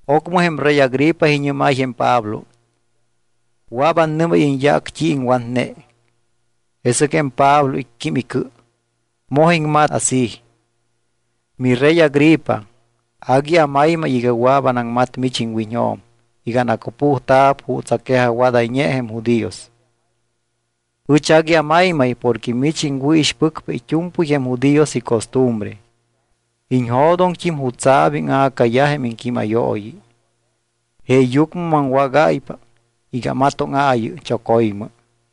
Ocmɨ jém rey Agripa iñɨ́máy jém Pablo: —Wɨa̱p annɨ́máy iñyaac t́i iŋwatne. Jesɨc jém Pablo icquím icɨ, moj iŋmat así: —Mirey Agripa, agui amaymay iga wɨa̱p anaŋmat mich iŋwiñjo̱m iga anacupujta̱p juuts aquejajwadayñe jém judíos. Ɨch agui amaymay porque mich iŋwɨ̱ixpɨcpa it́u̱mpɨy jém judíos icostumbre. Iñjo̱doŋt́im jutsa̱p íŋa̱cayaj jém iŋquímayooyi. Jeeyucmɨ maŋwágáypa iga amatóŋaayɨ choco̱ymɨ.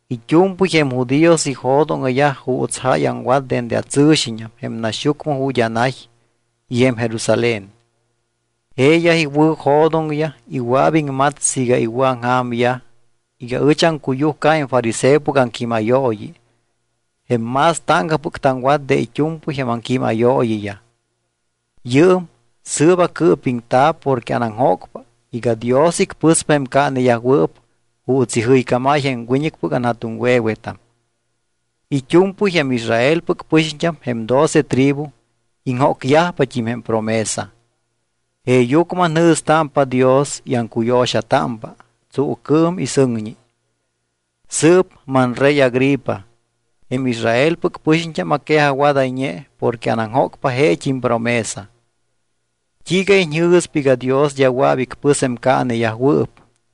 ’It́u̱mpɨy jém judíos ijo̱doŋyaj juuts jáy aŋwat dende atsɨ̱xiñam jém naxyucmɨ ju̱t́ anay y jém Jerusalén. Jeeyaj iwɨ̱jo̱doŋyaj y wɨa̱p iŋmat siiga iwɨ̱aŋja̱myaj iga ɨch aŋcuyujca jém fariseopɨc aŋquímayooyi jém más táŋcapɨc taŋwat de it́u̱mpɨy jém aŋquímayooyiyaj. Yɨɨm sɨɨp acɨɨpiŋta̱p porque anaŋjócpa iga Dios icpɨspa jém caaneyajwɨɨp juuts ijɨycámáy jém wiñɨcpɨc anja̱tuŋwe̱wetam. It́u̱mpɨy jém Israelpɨc pɨxiñt́am, jém doce tribu, iŋjócyajpat́im jém promesa. Jeeyucmɨ anjɨ̱stámpa Dios y aŋcuyo̱xatámpa tsuucɨɨm y sɨŋñi. Sɨɨp, manrey Agripa, jém Israelpɨc pɨxiñt́am aquejajwadayñe porque anaŋjócpa jeet́im promesa. ¿T́iiga iñjɨ̱spa iga Dios d́a wɨa̱p icpɨs jém caaneyajwɨɨp?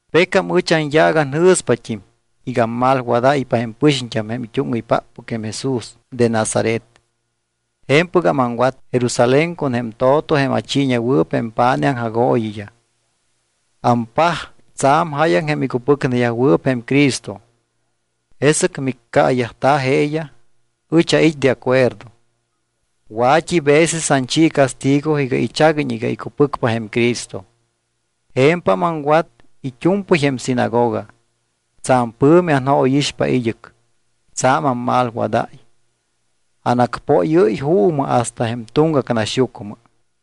’Pecam ɨch anyaac anjɨ̱spat́im iga ammalwadáypa jém pɨxiñt́am jém it́úŋɨypáppɨc jém Jesús de Nazaret. Je̱mpɨgam aŋwat Jerusalén con jém to̱to jém achiiñewɨɨp jém pa̱nij aŋjagooyiyaj. Ampaj tsa̱m jáyaŋ jém icupɨcneyajwɨɨp jém Cristo, jesɨc miccaayajta̱ jeeyaj, ɨch ait́ de acuerdo. Wa̱t́i veces anchi castigo iga ichaguiñ iga icupɨcpa jém Cristo. Je̱mpam aŋwat it́u̱mpɨy jém sinagoga. Tsa̱m pɨ̱mi anjóyixpa id́ɨc. Tsa̱m ammalwadáy, anacpóyɨ́y juumɨ hasta jém tuŋgac naxyucmɨ.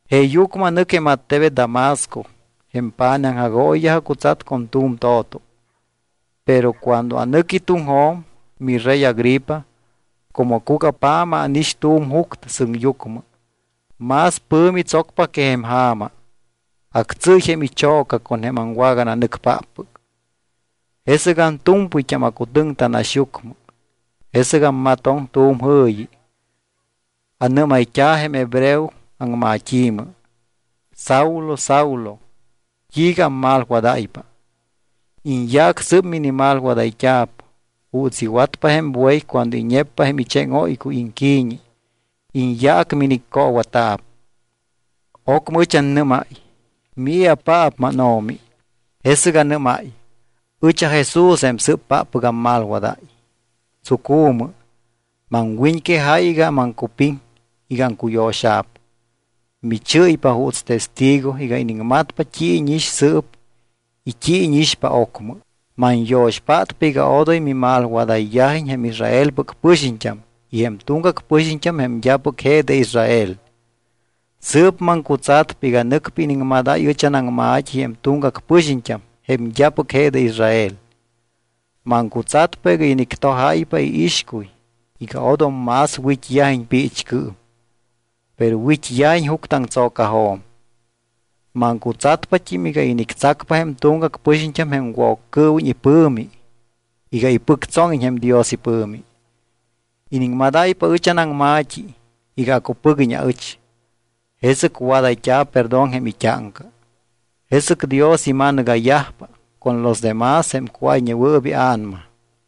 ’Jeeyucmɨ anɨc jém attebet Damasco. Jém pa̱nij aŋjagooyiyaj acutsat con tu̱m to̱to. Pero cuando anɨqui tuŋjo̱m, mirey Agripa, como cugapja̱ma ánix tu̱m juctɨ sɨŋyucmɨ. Más pɨ̱mi tsocpa que jém ja̱ma. Actsɨ́y jém icho̱ca con jém aŋwagananɨcpáppɨc. ’Jesɨc antu̱mpɨyt́am acutɨŋta naxyucmɨ. Jesɨc ammatoŋ tu̱m jɨ̱yi, anɨ́mayt́a̱ jém hebreo aŋmat́i̱mɨ: “¿Saulo, Saulo, t́iiga ammalwadáypa? Iñyaac sɨɨp minimalwadayt́a̱p; juuts iwatpa jém buey cuando iñeppa jém icheŋóycuy iŋqui̱ñi, iñyaac miniccoowata̱p.” Ocmɨ ɨch annɨ́máy: “¿Mii̱apaap, mánO̱mi?” Jesɨc anɨ́máy: “Ɨch aJesús jém sɨ́ppáppɨc ammalwadáy. Tsucu̱mɨ. Maŋwiñquejáy iga maŋcupiŋ iga aŋcujo̱xa̱p. Michɨ́ypa juuts testigo iga iniŋmatpa t́i íñix sɨɨp y t́i íñixpa ocmɨ. Manyo̱xpátpa iga odoy mimalwadayyajiñ jém Israelpɨc pɨxiñt́am y jém tuŋgac pɨxiñt́am jém d́apɨc je de Israel. Sɨɨp maŋcutsatpa iga nɨcpa iniŋmadáy ɨch anaŋma̱t́i jém tuŋgac pɨxiñt́am jém d́apɨc je de Israel. Maŋcutsatpa iga inictojáypa iixcuy iga odom más wit́yajiñ piichcɨɨm, pero wit́yajiñ juctɨaŋtso̱cajo̱m. Maŋcutsatpat́im iga inictsacpa jém tuŋgac pɨxiñt́am jém Woccɨɨwiñ ipɨ̱mi iga ipɨctsóŋiñ jém Dios ipɨ̱mi. Iniŋmadáypa ɨch anaŋma̱t́i iga acupɨguiñ aɨch, jesɨc wadayt́a̱p perdón jém it́áŋca. Jesɨc Dios ima̱nɨga̱yajpa con los demás jém cuáyñewɨɨp ia̱nama.”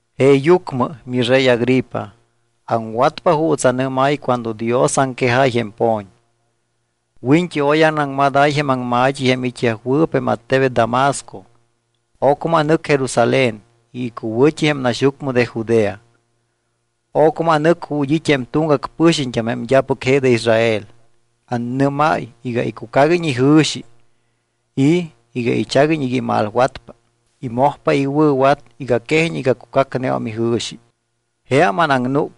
’Jeeyucmɨ, mirey Agripa, aŋwatpa juuts anɨ́máy cuando Dios aŋquejáy jém po̱ñ. Wiñt́i oy anaŋmadáy jém aŋma̱t́i jém it́yajwɨɨp jém attebet Damasco, ocmɨ anɨc Jerusalén y icuwɨ̱t́i jém naxyucmɨ de Judea. Ocmɨ anɨc ju̱t́ it́ jém tuŋgac pɨxiñt́am jém d́apɨc je de Israel. Anɨ́máy iga icucaguiñ ijɨ̱xi y iga ichaguiñ iga imalwatpa y mojpa iwɨ̱wat iga quejiñ iga cucacneum ijɨ̱xi. Jeam anaŋnúc.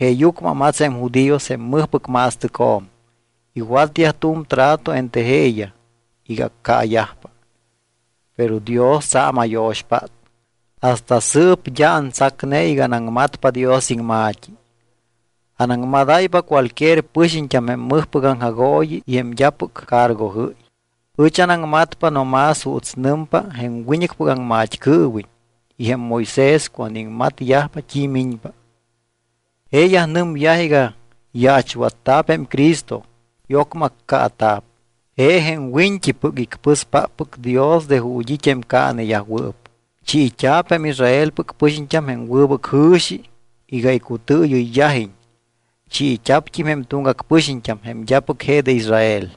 Jeeyucmɨ amats jém judíos jém mɨjpɨc ma̱stɨcjo̱m. Iwatyaj tu̱m trato entre jeeyaj iga accaayajpa. Pero Dios tsa̱m ayo̱xpát. Hasta sɨɨp d́a antsacne iga anaŋmatpa Dios iŋma̱t́i. Anaŋmadáypa cualquier pɨxiñt́am jém mɨjpɨc aŋjagooyi y jém d́apɨc cargojɨ́y. Ɨch anaŋmatpa no más juuts nɨmpa jém wiñɨcpɨc aŋmat́cɨɨwiñ y jém Moisés cuando iŋmatyajpa t́i miñpa. Jeeyaj nɨmyaj iga yaachwatta̱p jém Cristo y ocmɨ accaata̱p. Je jém wiñt́ipɨc icpɨspáppɨc Dios de ju̱t́ it́ jém caaneyajwɨɨp. Chiit́a̱p jém Israelpɨc pɨxiñt́am jém wɨbɨc jɨ̱xi iga icutɨɨyɨyyajiñ. Chiit́a̱pt́im jém tuŋgac pɨxiñt́am, jém d́apɨc je de Israel.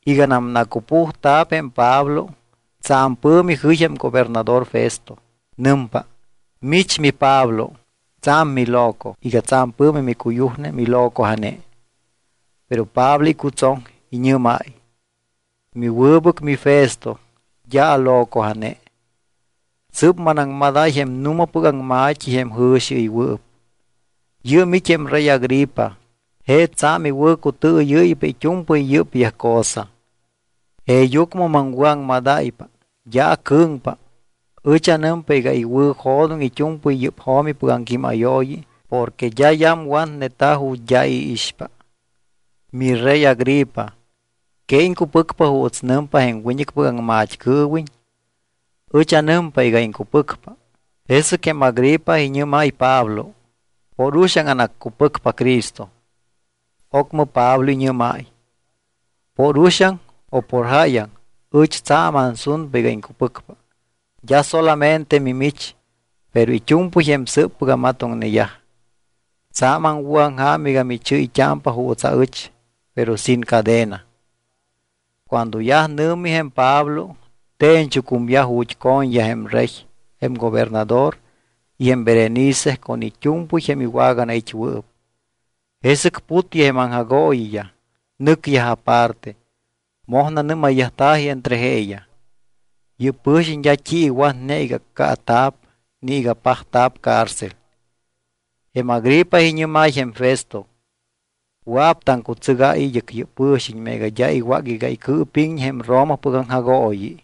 Iganam nacupujta̱p jém Pablo, tsa̱m pɨ̱mi jɨy jém gobernador Festo. Nɨmpa: —¡Mich, miPablo, tsa̱m miloco! Iga tsa̱m pɨ̱mi micuyujne milocoja̱ne. Pero Pablo icutsoŋ. Iñɨ́máy: —Miwɨbɨc miFesto d́a alocoja̱ne. Sɨ́p manaŋmadáy jém nu̱mapɨc aŋma̱t́i jém jɨ̱xiɨywɨɨp. Yɨɨm it́ jém rey Agripa. Je tsa̱m iwɨ̱cutɨɨyɨ́ypa it́u̱mpɨy yɨ́pyaj cosa. Jeeyucmɨ maŋwɨ̱aŋmadáypa, d́a acɨ̱ŋpa. Ɨch anɨmpa iga iwɨ̱jo̱doŋ it́u̱mpɨy yɨ́p jo̱mipɨc aŋquímayooyi porque d́a yamwatneta̱ ju̱t́ d́a i̱ iixpa. Mirey Agripa, ¿que iŋcupɨcpa juuts nɨmpa jém wiñɨcpɨc aŋmat́cɨɨwiñ? Ɨch anɨmpa iga iŋcupɨcpa. Jesɨc jém Agripa iñɨ́máy Pablo: —Por uxaŋ anaccupɨcpa Cristo. Ocmɨ Pablo iñɨ́máy: —Por uxaŋ o por jáyaŋ, ɨch tsa̱m ansunpa iga iŋcupɨcpa. D́a solamente mimich, pero it́u̱mpɨy jém sɨɨppɨc amatoŋneyaj. Tsa̱m aŋwɨ̱aŋja̱m iga michɨ́yt́ámpa juuts aɨch, pero sin cadena. Cuando yaj nɨ̱mi jém Pablo, te̱ñchucumyaj ju̱t́ co̱ñyaj jém rey, jém gobernador y jém Berenice con it́u̱mpɨy jém iwaganait́wɨɨp. Jesɨc putyaj jém aŋjagooyiyaj, nɨcyaj aparte. Moj nanɨ́mayyajta̱ji entre jeeyaj: —Yɨ́p pɨ̱xiñ d́a t́i iwatne iga accaata̱p ni iga pajta̱p cárcel. Jém Agripa iñɨ́máy jém Festo: —Wɨa̱p taŋcutsɨgáy id́ɨc yɨ́p pɨ̱xiñ meega d́a iwác iga icɨɨpíŋiñ jém Romapɨc aŋjagooyi.